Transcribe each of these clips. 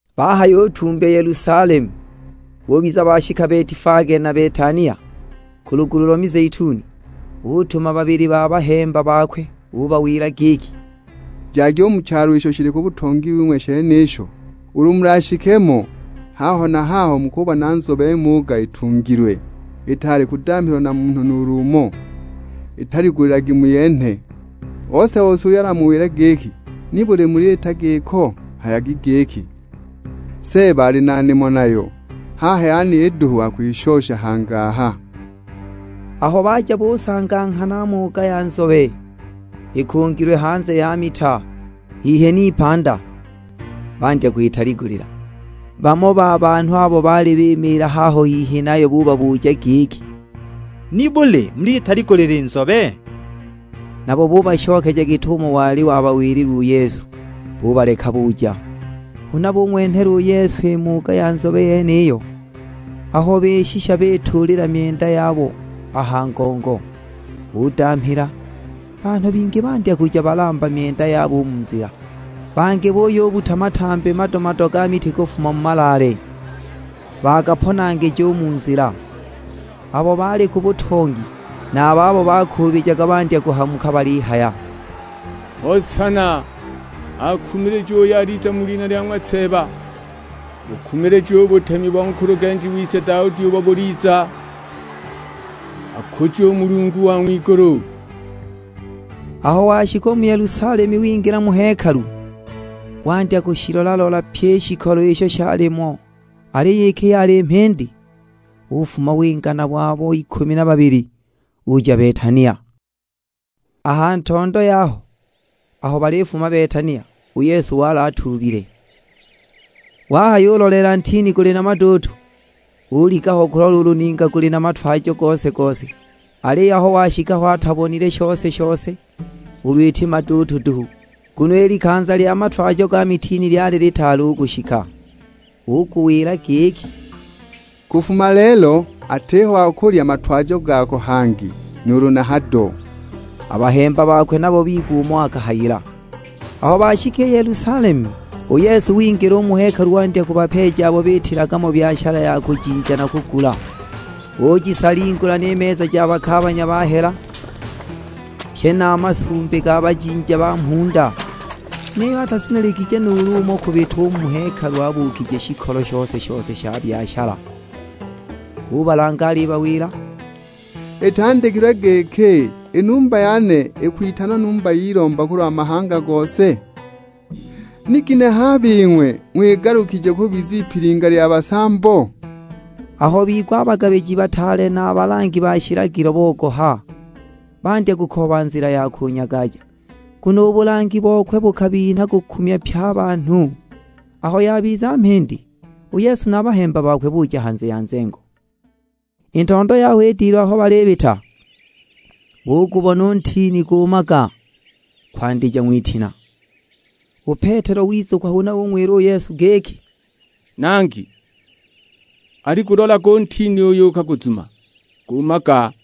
Bahayutumbya Yelusalemu, bubiza bashika Betifage na Betania, ku lugulu lo mizeituni, utuma babili ba bahemba bakwe. Ubawila giki, "Jagi u mu chalo isho shili ku butongi wing'we shenisho, ulu mulashike mo, haho na haho mukubona nzobe muuga ikungilwe. Itaali kudamhilwa na munhu nuulu umo, italigulilagi muyenhe. Ose-ose uyo alamuwile giki, 'Nibuli muliita giko?' Hayagi giki, 'Seeba ali na nimo nayo, haha yeniyi duhu akwishosha hangi aha.' " Aho baja busanga nghana muuga ya nzobe, ikungilwe hanze ya mita, hihi n'ipanda, bandya kwitaligulila. Bamo ba banhu abo baali bimiila haho hihi nayo bubabuja giki, "Nibuli muliyitaligulila i nzobe?" Nabo bubashokeja git'umo wali wabawilila u Yesu, bubaleka buja. Huna bung'wenhela u Yesu i muuga ya nzobe yeniyo, aho bishisha bituulila myenda yabo a ha ngongo, udamhila. Banhu bingi bandya kuja balamba myenda yabo u mu nzila, bangi buyubbuta matambi mado-mado ga miti kufuma mu malaale, bagaponangija u mu nzila. Abo baali ku butongi, na a babo bakuubijaga bandya kuhamuka balihaya, "Hosana! Akumilijiwe uyo aliza mu lina lya ng'wa Seeba. Bukumilijiwe u butemi bo nkulugenji wise Daudi ubo buliza. Akujiwe u Mulungu wa ng'wigulu!" Aho washika u mu Yelusalemu wingila mu hekalu, wandya kushilola-lola pyi i shikolo isho shalimo. Aliyo iki yali mhindi, ufuma winga nabo abo ikumi na babili, uja Betania. A ha ntondo yaho, aho balifuma Betania, u Yesu wali atuubile. Wahayuloleela ntini guli na maduutu, uliga ho kulola ulu ninga guli na matwajo gose-gose. Aliyo aho washika ho atabonile shose-shose, ulu iti maduutu duhu, nguno i likanza lya matwajo ga mitini lyali litaali u kushika. Uguwila giki, "Kufuma lelo atiho wa kulya matwajo gako hangi nuulu na hado!" A bahemba bakwe nabo bigwa umo akahayila. Aho bashika i Yelusalemu, u Yesu wingila u mu hekalu wandya kubapeeja abo biitilaga mo byashala ja kujinja na kugula. Ujisalingula ni meza ja bakaabanya ba hela, pye na a masumbi ga bajinja ba mhunda. Niyo atazuniligije nuulu umo kubita u mu hekalu abuukije shikolo shose-shose sha byashala. Ubalanga alibawila, "Itandikilwe giki, 'I numba yane ikwitanwa numba y'ilomba kulwa mahanga gose?' Ni ginehe a bing'we ng'wigalukije kubiza ipilinga lya basambo?" Aho bigwa a bagabiji bataale na a balangi ba shilagilo bogoha, bandya kukooba nzila ya kunyagaja, nguno u bulangi bokwe bukabinha kukumya pye a banhu. Aho yabiza mhindi, u Yesu na a bahemba bakwe buja hanze ya nzengo. I ntondo yaho i dilu aho balibita, bugubona u ntini guumaga kwandija ng'witina. U Petelo wizukwa, huna ung'wila u Yesu giki, "Nangi, aligulolage u ntini uyo ukaguzuma, guumaga!"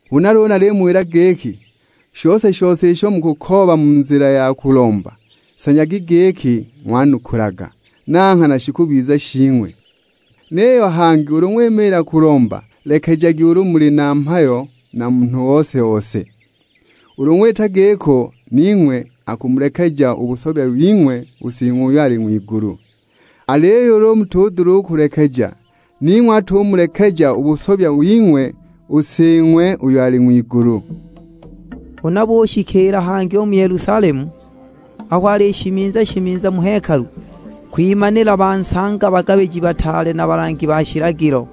Huna luulu nalimuwila giki, shose-shose isho mukukooba mu nzila ya kulomba, sanyagi giki, ng'wanukulaga; na nghana shikubiza shing'we. Niyo hangi ulu ng'wimiila kulomba lekejagi ulu muli na mhayo na munhu ose-ose. Ulu ng'wita giko ning'we akumulekeja u busobya wing'we u Sing'we uyo ali ng'wigulu. [ Aliyo ulu mutudula u kulekeja, ning'we atumulekeja u busobya wing'we u Sing'we uyo ali ng'wigulu.]" Huna bushikiila hangi u mu Yelusalemu, aho alishimiza-shimiza mu hekalu, kwimanila bansanga bagabiji bataale na balangi ba shilagilo,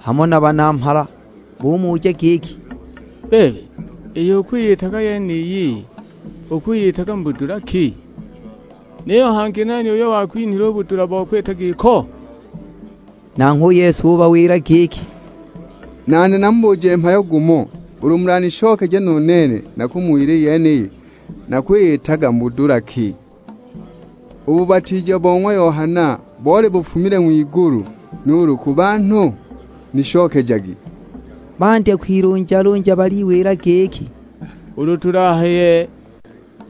hamo na banamhala. Bumuja giki, "Bebe, iyo ukwiyitaga yeniyi, ukwiyitaga mu budula ki? Niyo hangi nani uyo wakwinhile u budula bo kwita giko?" Nanghwe u Yesu ubawila giki, "Nane namubuje mhayo gumo, ulu mulanishokeje nu nene nakumuwila i yeniyi nakwiyitaga mu budula ki. U bubatiija bo ng'wa Yohana boli bufumile ng'wigulu nuulu ku banhu? Nishokejagi!" Bandya kwilunjalunja baliwila giki, "Ulu tulahaye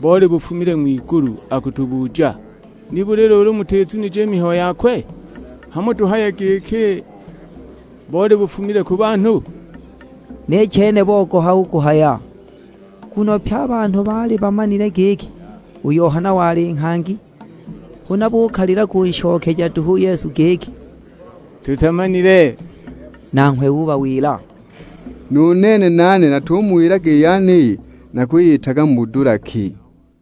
boli bufumile ng'wigulu, akutubuja, 'Nibuli luulu mutizunije i mihayo yakwe?' Hamo tuhaye giki, 'Boli bufumile ku banhu?' " Ni chene bogoha u kuhaya, nguno pye a banhu baali bamanile giki, u Yohana wali nghangi. Huna bukalila kunshokeja duhu u Yesu giki, "Tutamanile!" Nanghwe ubawila, "Nu nene natumuwilaga i yeniyi nakwiyitaga mu budula ki!"